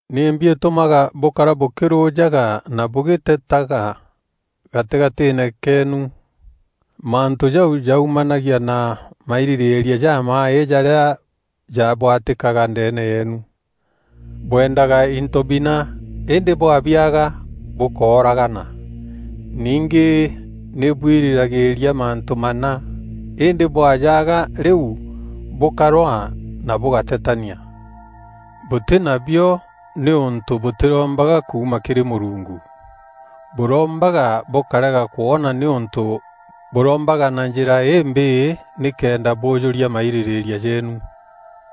Nîmbi îtûmaga bûkara bûkîrûjaga na bûgîtetaga gatîgatîîne keenu? Mantû jau jaumanagia na mairîrîîria jamaaî jarîa jabwatîkaga ndeene yeenu. Bwendaga into bina îndî bwabiaga, bûkooragana. Ningî nî bwirîragîîria mantû mana, îndî bwajaga rîu bûkarwaa na bûgatetania. Bûtî nabio nîûntû bûtîrombaga kuuma kîrî Mûrungu. Bûrombaga bûkarega kwona nîûntû bûrombaga na njîra îmbîî nîkenda bûjûria mairîrîîria jeenu.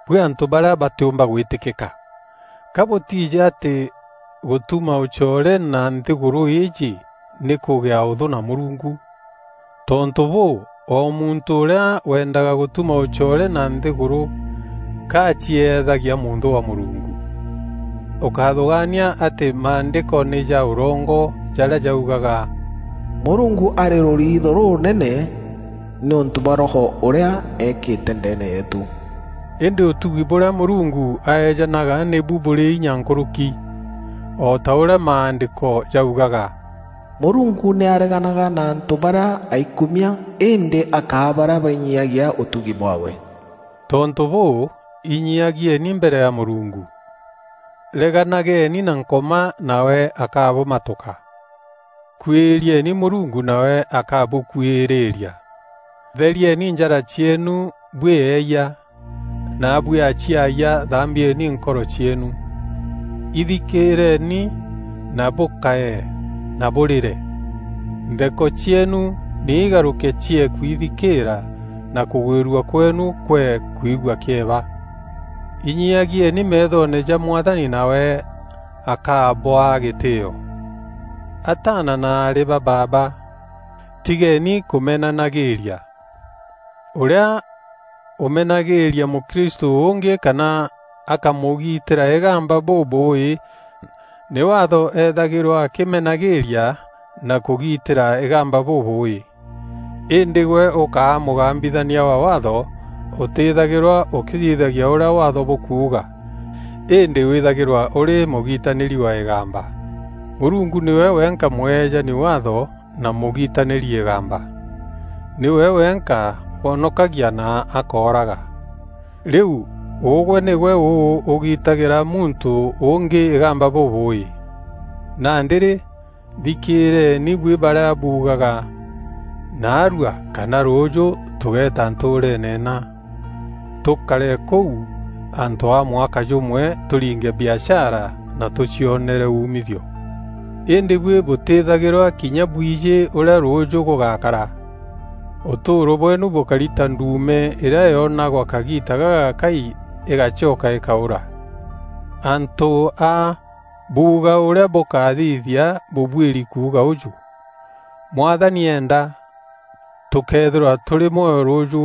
Buî antû barîa batîûmba gwîtîkîka! Ka bûtiijî atî gûtuma ûcoore na nthîgûrû îîjî nî kûgîa ûthû na Mûrungu? Tontû bûû, o muntû ûrîa wendaga gûtuma ûcoore na nthîgûrû, ka acieethagia mûnthû wa Mûrungu. Ûkáthûgaania atî Maandîko nî ja ûrongo jarîa jaugaga, “Mûrungu arî rûriitho rûûneene nîûntû bwa Roho ûrîa eekîte ndeene yeetû.” Îndî ûtugi bûrîa Mûrungu aeejanaga nîbu bûrî inya nkûrûki. O ta ûrîa Maandîko jaugaga, “Mûrungu nî areganaga na antû barîa aikumia îndî akaa barîa bainyiiagia ûtugi bwaawe.” Tontû bûû, inyiiagieni mbere ya Mûrungu. Reganageni na Nkoma nawe akabûmatûka. Kuîrieni Mûrungu nawe akabûkuîrîîria. Therieni njara cieenu buî eeyia, naabuî aciayia thambieni nkoro cieenu. Ithikîîreni na bûkaye na bûrîre. Ntheko cieenu nî igarûke ciee kwithikîîra na kûgwîrua kweenu kwee kwigua kîeba. Inyiagieni meethoone ja Mwathani nawe akabûa gîtîîo. Ataana na aarî ba baaba, tigeeni kûmenanagîîria. Ûrîa ûmenagîîria mûkristû ûngî kana akamûgitîra îgamba bûbûûî nî Waatho ethagîrwa akîmenagîîria na kûgitîra îgamba bûbûûî. Îndî gwe ûkä mûgambithia wa Waatho ûtîthagîrwa ûkîthithagia ûrîa Waatho bûkuuga, îndî wîthagîrwa ûrî mûgitanîri wa îgamba. Mûrungu nîwe wenka mwejani Waatho na mûgitanîri îgamba. Nîwe wenka wonokagia na akooraga. Rîu, ûgwe nîgwe ûu ûgitagîra muntû ûngî îgamba bûbûûî? Nandî rî, thikîîreeni buî barîa buugaga, “Naarua, kana rûûjû tûgeeta ntûûreene nna, tûkare kûu antû a mwaka jûmwe tûringe biashara na tûcionere umithio.” Îndî buî bûtîîthagîrwa kinya bwijî ûrîa rûûjû gûgakara. Ûtûûro bweenu bûkari ta nduume îrîa yonagwa kagiita gagakai îgacoka îkaûra. Antû a buuga ûrîa bûkathithia, bûbuîri kuuga ûjû, “Mwathani eenda, tûkeethîrwa tûrî mwoyo rûûjû,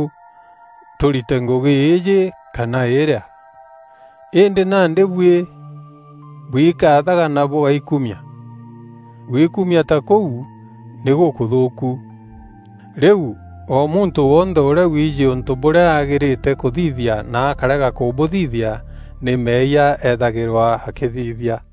tûrite ngûgî îîjî kana îrîa.” Îndî nandî buî bwikaathaga na bûgaikumia. Gwikumia ta kûu nî gûkûthûûku. Rîu, o muntû wonthe ûrîa wiijî ûntû bûrîa agîîrîte kûbûthithia na akarega kûbûthithia, nî meeyia eethagîrwa akîthithia.